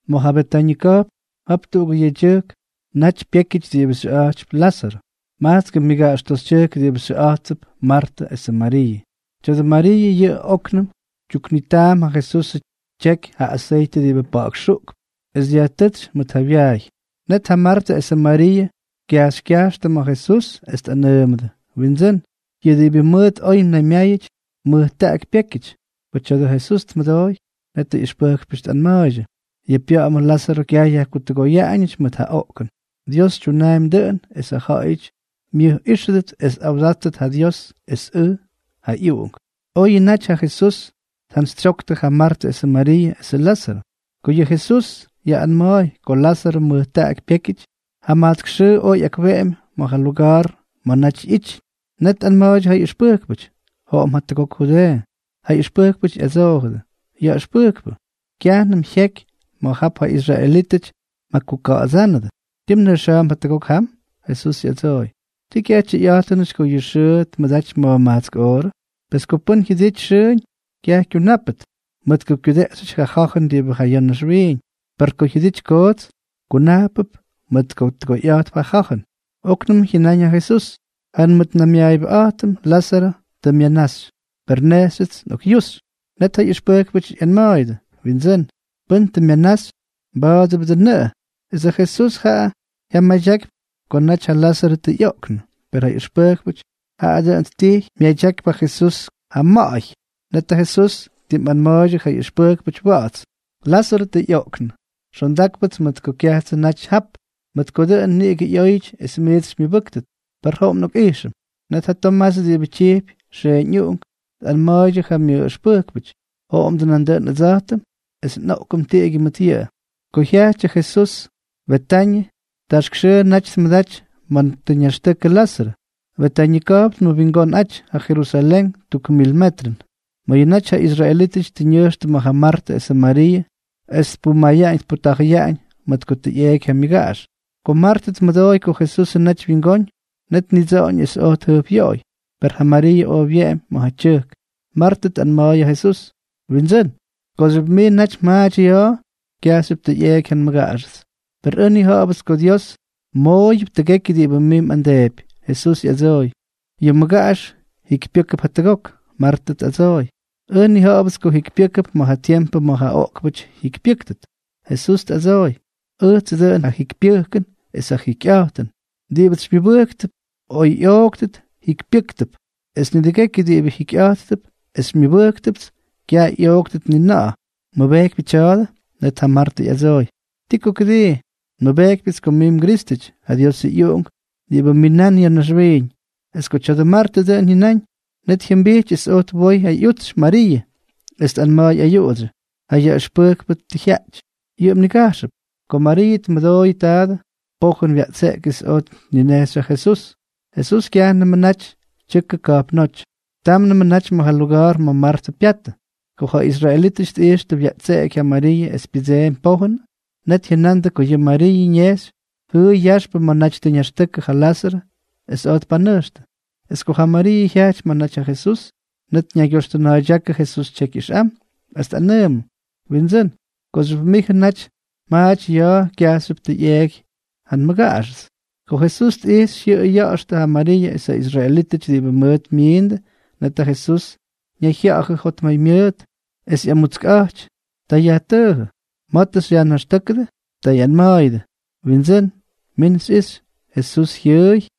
Ma̱ ja Betañʉ ka̱jpn, jap tuꞌugʉ yedyʉjkʉ naty pyékyʉty diꞌibʉ xyʉꞌa̱jty Lázarʉ. Majtskʉ myʉgaꞌax toxytyʉjk diꞌibʉ xyʉꞌa̱jttʉp Martʉ esʉ Mariiʉ. Tya̱dʉ Mariiʉ yʉꞌʉ óknʉm tyuknitaam ja Jesusʉ tyeky ja aseytʉ diꞌibʉ pa̱ꞌa̱k xuꞌkp, es dyajtʉ́tsy mʉt ja wyaay. Net ja Martʉ esʉ Mariiʉ kyajxykyajxtʉ ma̱ Jesús es tꞌanʉʉmʉdʉ: —Windsʉ́n, yʉ diꞌibʉ mʉt oy mnaymyáyʉty mʉjtaꞌaky pyékyʉty. Ko tya̱a̱dʉ Jesús tmʉdooy, net ja ꞌyʉxpʉjkpʉty tꞌanma̱a̱ydyʉ: —Yʉ pya̱ꞌa̱mʉ Lázarʉ kyaj yajkutʉgoyaꞌañʉty mʉt ja oꞌkʉn. Dios tyunaampy dʉꞌʉn es ja ja̱ꞌa̱yʉty myʉjꞌíxʉdʉt es tꞌawdáttʉt ja Dios es ʉj, ja ꞌyUꞌunk. Oyʉ naty ja Jesús tjantsytsyoktʉ ja Martʉ esʉ Mariiʉ esʉ Lázarʉ, ko yʉ Jesús yaꞌꞌanma̱a̱y ko Lázarʉ mʉjtaꞌaky pyékyʉty, jamajtsk xʉʉ oj ꞌyakweꞌemy ma̱ ja luga̱a̱r ma̱ naty ꞌyityʉn. Net tꞌanma̱a̱ydyʉ ja ꞌyʉxpʉjkpʉty: —Joꞌom jatʉgok Judeeʉ. Ja ꞌyʉxpʉjkpʉty ꞌyadsoojʉdʉ: —Yaꞌʉxpʉjkpʉ, kyajnʉm jyeky ma̱ jap ja israelítʉty mjakuka̱ꞌa̱dsánʉdʉ. ¿Tii mnʉjxa̱a̱mp jatʉgok jam? Jesús ꞌyadsooy: —¿Ti kyaj tyʉyꞌa̱jtʉnʉty ko yʉ xʉʉ tmʉdaty ma̱jmajtsk oorʉ? Pes ko pʉ́n jyʉdity xʉʉñ, kyaj kyunápʉt, mʉt ko kyudeꞌxyʉty ja ja̱jʉn diꞌibʉ ja ya̱ naxwiiñ. Per ko jyʉdity koots, kunajpʉp mʉt ko tʉgoyꞌa̱jtp ja ja̱jʉn. Oknʉm jyʉnáñ ja Jesús: —Ja nmʉtnaymyaayʉbʉꞌa̱jtʉm Lázarʉ tʉ myanaxy. Per nejxyʉts nꞌokꞌyuxy. Net ja ꞌyʉxpʉjkpʉty ꞌyanma̱a̱yʉdʉ: —Windsʉ́n, pʉn tʉ myanaxy, mʉba̱a̱dʉbʉ dʉꞌʉnʉꞌʉ. Es ja Jesús jaꞌa jyamadyakypy ko naty ja Lázarʉ tʉ ꞌyoꞌknʉ, per ja ꞌyʉxpʉjkpʉty, jaꞌa dʉn ttijy myadyakypy ja Jesús ja ma̱ꞌa̱y. Net ja Jesús ttimꞌanma̱a̱ydyʉ ja ꞌyʉxpʉjkpʉty wa̱ꞌa̱ts: —Lázarʉ tʉ ꞌyoꞌknʉ. Xondákpʉts mʉt ko kyajtsʉ naty jap, mʉt ko dʉꞌʉn niꞌigʉ ꞌyóyʉty es miits xymyʉbʉ́ktʉt. Per joꞌom nꞌokꞌijxʉm. Net ja Tomás diꞌibʉ tyijpy Xeeñuꞌunk, tꞌanma̱a̱ydyʉ ja myʉꞌꞌʉxpʉjkpʉty: —Joꞌomdʉ nandʉꞌʉn ʉdsa̱jtʉm es nꞌoꞌkʉm tiꞌigyʉ mʉt yʉꞌʉ. Ko jyajty ja Jesús Betañʉ, taxk xʉʉ naty tmʉdaty ma̱ ñaxtʉkʉ Lázarʉ. Betañʉ ka̱jpn tmʉwingonꞌaty ja Jerusalén tʉgʉk mil metrʉn. Mayʉ naty ja israelítʉty tʉ ñʉjxtʉ ma̱ ja Martʉ esʉ Mariiʉ es tpumayaꞌañ tputa̱jʉyaꞌañ mʉt ko tʉ ꞌyeeky ja myʉgaꞌax. Ko Martʉ tmʉdooy ko Jesusʉ naty wyingóñ, net tnidsoꞌoñ es oj tjʉjpꞌyoꞌoy, per ja Mariiʉ oj wyeꞌemy ma̱ ja tyʉjk. Martʉ tꞌanma̱a̱y ja Jesús: —Windsʉ́n, kooxyʉp mijʉ naty mjaaty ya̱a̱, kyajxyʉp tʉ ꞌyeeky ja nmʉgaꞌaxʉts. Per ʉj nnija̱ꞌa̱bʉts ko Dios mmooyʉp tʉgekyʉ diꞌibʉ mij mꞌamdeepy. Jesús ꞌyadsooy: —Yʉ mmʉgaꞌax jikypyʉ́kʉp jatʉgok. Martʉ tꞌadsooy: —Ʉj nnija̱ꞌa̱bʉts ko jikypyʉ́kʉp ma̱ ja tiempʉ ma̱ ja oꞌkpʉty jyikypyʉ́ktʉt. Jesús tꞌadsooy: —Ʉjtsʉ dʉꞌʉn ja jikypyʉjkʉn es ja jikyꞌa̱jtʉn. Diꞌibʉts xymyʉbʉjkp, oy ꞌyoogʉt, jikypyʉ́kʉp. Es nidʉgekyʉ diꞌibʉ jikyꞌa̱jttʉp es xymyʉbʉ́ktʉts, kyaj ꞌyooktʉt ni na̱ꞌa̱. ¿Mmʉbejkypyʉ tya̱a̱dʉ? Net ja Martʉ ꞌyadsooy: —Ti ko kʉdii. Nmʉbejkypyʉts ko mij mGrístʉty, ja Diosʉ ꞌyUꞌunk diꞌibʉ minán ya̱ naxwiiñ. Es ko tya̱a̱dʉ Martʉ dʉꞌʉn jyʉnáñ, net jyʉmbijty es oj twoy ja ꞌyutsy Mariiʉ, es tꞌanma̱a̱y ayuꞌudsyʉ: —Ja yaꞌʉxpʉjkpʉ tʉ jyaꞌty. Yʉꞌʉ mnigajxʉp. Ko Mariiʉ tmʉdooyʉ taadʉ, pojʉn wyaꞌtseꞌky es oj tninejxy ja Jesús. Jesús kyajnʉmʉ naty tyʉkʉ ka̱jpnóty, támnʉmʉ naty ma̱ ja luga̱a̱r ma̱ Martʉ pyatʉ. Ko ja israelítʉty tꞌijxtʉ wyaꞌtseꞌky ja Mariiʉ es pyʉdseemy pojʉn, net jyʉnandʉ ko yʉ Mariiʉ ñejxy jʉʉy yaxpʉ ma̱ naty tʉ ñaxtʉkʉ ja Lázarʉ, es oj tpanʉjxtʉ. Es ko ja Mariiʉ jyajty ma̱ naty ja Jesús, net ñaygyoxtʉna̱a̱ydyákʉ Jesús tyekyꞌʉjxm es tꞌanʉʉmʉ: —Windsʉ́n, kooxyʉp mijʉ naty mjaaty ya̱a̱, kyajxyʉpts tʉ ꞌyeeky ja nmʉgaꞌax. Ko Jesús tꞌijxy jyʉꞌʉy yaxtʉ ja Mariiʉ es ja israelítʉty diꞌibʉ mʉt myiindʉ, net ja Jesús ñayjya̱ꞌa̱jʉ jotmaymyʉʉt es ꞌyamutskꞌa̱jty. Ta yajtʉʉjʉ: —¿Ma̱ tʉ xyajnaxtʉ́kʉdʉ? Ta ꞌyanma̱a̱yʉdʉ: —Windsʉ́n, min xyꞌixy. Jesús jyʉʉy.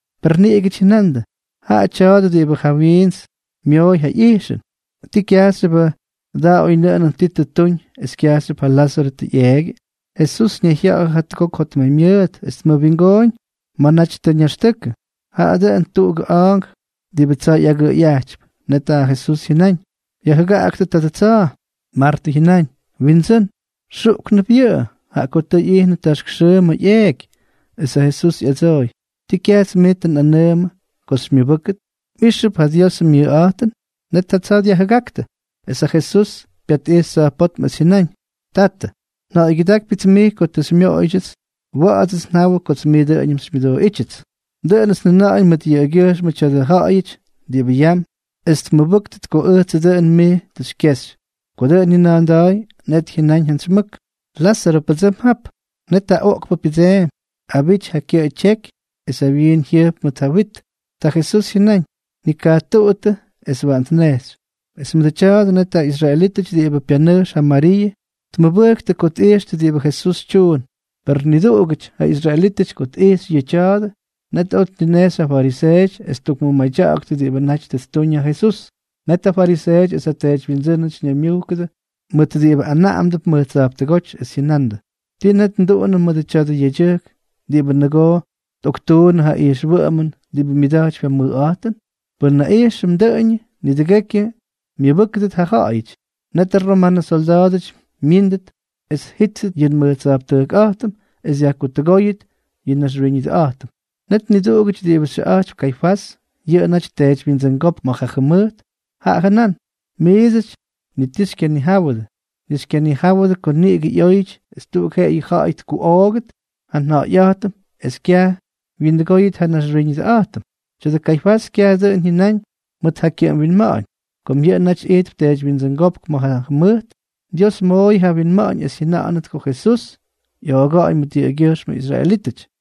Per niduꞌugʉty jyʉnandʉ: —Jaꞌa tya̱a̱dʉ diꞌibʉ ja wiints myooy ja ꞌyijxʉn, ¿tii kyajxyʉbʉ da oynʉꞌʉnʉn ti tʉ ttuñ es kyajxyʉp ja Lázarʉ tʉ ꞌyeegyʉ? Jesús ñayjya̱ꞌa̱jʉ jatʉgok jotmaymyʉʉt es tmʉwingooñ ma̱ naty tʉ ñaxtʉkʉ. Jaꞌa dʉn tuꞌugʉ a̱a̱nk diꞌibʉ tsa̱a̱ ꞌyagʉꞌʉyꞌajtypy. Net ja Jesús jyʉnáñ: —Yajjʉgaꞌaktʉ tadʉ tsa̱a̱. Martʉ jyʉnáñ: —Windsʉ́n, xuꞌknʉp yʉꞌʉ, jaꞌa ko tʉ ꞌyijnʉ taxk xʉʉ ma̱ ꞌyeeky. Es ja Jesús ꞌyadsooy: —¿Ti kyajts mij tʉ nꞌanʉʉmʉ ko xymyʉbʉ́kʉt, mꞌíxʉp ja Diosʉ myʉjꞌa̱jtʉn? Net ja tsa̱a̱ dyajjʉgáktʉ. Es ja Jesús pyatꞌijxy tsa̱jpótm es jyʉnáñ: —Tatʉ, nja̱ꞌa̱ygyʉdákypyʉts mij ko tʉ xymyʉdóyʉts. Wa̱ꞌa̱dsʉts nnijawʉ kots mij dʉꞌʉñʉm xymyʉdooꞌítyʉts. Dʉꞌʉnʉts njʉna̱ꞌa̱ñ mʉt yʉꞌʉgyʉjxmʉ tya̱dʉ ja̱ꞌa̱yʉty diꞌibʉ yam, es tmʉbʉ́ktʉt ko ʉjtsʉ dʉꞌʉn mij tʉ xykyexy. Ko dʉꞌʉn jyʉna̱a̱nda̱a̱y, net jyʉnáñ jantsy mʉk: —¡Lázarʉ, pʉdsʉm jap! Net ja oꞌkpʉ pyʉdseemy, abity ja kyʉꞌʉ tyeky es ja wyiin jyʉjp mʉt ja wyit. Ta Jesús jyʉnáñ: —Nikajtuꞌuttʉ es waꞌan tnejxy. Es mʉdʉ tya̱a̱dʉ, net ja israelítʉty diꞌibʉ pyanʉjx ja Mariiʉ tmʉbʉjktʉ ko tꞌijxtʉ diꞌibʉ Jesús tyuun. Per niduꞌugʉty ja israelítʉty ko tꞌijxy yʉ tya̱a̱dʉ, net oj tninejxy ja fariseeʉty es ttukmʉmadyaktʉ diꞌibʉ naty tʉ ttuñ ja Jesús. Net ja fariseeʉty es ja teedywyindsʉ́nʉty ñaymyujkʉdʉ mʉt diꞌibʉ anaꞌamdʉp mʉj tsa̱jptʉgóty, es jyʉnandʉ: —¿Ti net nduꞌunʉm mʉdʉ tya̱dʉ yedyʉjk diꞌibʉ nʉgoo tꞌoktuunnʉ ja ijxwʉꞌʉmʉn diꞌibʉ myʉda̱jtypy ja mʉjꞌa̱jtʉn? Pʉn nnaꞌijxʉm dʉꞌʉñʉ, nidʉgekyʉ myʉbʉ́kʉdʉt ja ja̱ꞌa̱yʉty. Netʉ romanʉ solda̱a̱dʉty myíndʉt es tjíttʉt yʉ nmʉj tsa̱jptʉjkꞌa̱jtʉm es dyajkutʉgóyʉt yʉ nnaxwiñʉdʉꞌa̱jtʉm. Net niduꞌugʉty diꞌibʉ xyʉꞌa̱jtypy Kaifás, yʉꞌʉ naty teedywyindsʉngópk ma̱ ja jʉmʉjt, jaꞌa jʉnán: —Miidsʉty ni ti xykyanijáwʉdʉ, ni xykyanijáwʉdʉ ko niꞌigʉ ꞌyóyʉty es tuꞌuk jeꞌeyʉ ja̱ꞌa̱y tkuꞌoogʉt ja nja̱ꞌa̱yꞌa̱jtʉm es kyaj wyindʉgóyʉt ja nnaxwiñʉdʉꞌa̱jtʉm. Tya̱dʉ Kaifás kyaj dʉꞌʉn jyʉnáñ mʉt ja kyʉꞌʉm winma̱ꞌa̱ñ. Kom yʉꞌʉ naty ijtp teedywyindsʉngópk ma̱ ja jʉmʉjt, Dios mooyʉ ja winma̱ꞌa̱ñ es jyʉna̱ꞌa̱nʉt ko Jesús ꞌyooga̱ꞌa̱ñ mʉt yʉꞌʉgyʉjxmʉ israelítʉty,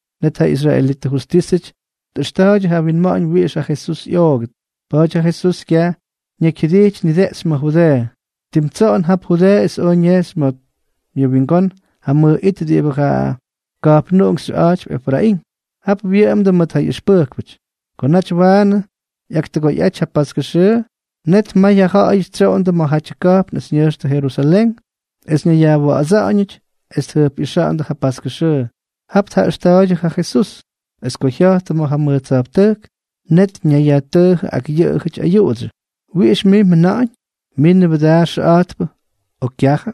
Net ja israelitʉ justísʉty tꞌʉxta̱a̱ydyʉ ja winma̱ꞌa̱ñ wiꞌix ja Jesús ꞌyoogʉt. Pa̱a̱ty ja Jesús kyaj ñakyjyʉdijty nideꞌxy ma̱ Judeeʉ, tim tsoꞌon jap Judeeʉ es oj ñejxy ma̱ myʉwingón ja mʉj it diꞌibʉ ja ka̱jpnuꞌunk xyʉꞌa̱jtypy Efraín. Jap wyʉꞌʉmdʉ mʉt ja ꞌyʉxpʉjkpʉty. Ko naty waanʉ ꞌyaktʉgoyꞌaty ja paskʉ xʉʉ, net may ja ja̱ꞌa̱yʉty tsyoꞌondʉ ma̱jatyʉ ka̱jpn es ñʉjxtʉ Jerusalén es ñayyajwa̱ꞌa̱dsa̱ꞌa̱ñʉty es tjʉjpꞌixa̱ꞌa̱ndʉ ja paskʉ xʉʉ. Jap tjaꞌʉxta̱a̱ydyʉ ja Jesús. Es ko jya̱jttʉ ma̱ ja mʉj tsa̱jptʉjk, net ñayyajtʉʉjʉ ak jaꞌayʉty ayuꞌudsyʉ: —¿Wiꞌix mij mjʉna̱ꞌa̱ñ? ¿Minʉ́bʉ daa xʉꞌa̱jtpʉ o kyajʉ?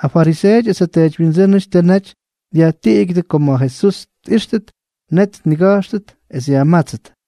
Ja fariseeʉty es ja teedywyindsʉ́nʉty tʉ naty dyajnigutúkʉ ko ma̱ Jesús tꞌíxtʉt, net tniga̱jxtʉt es yajmátsʉt.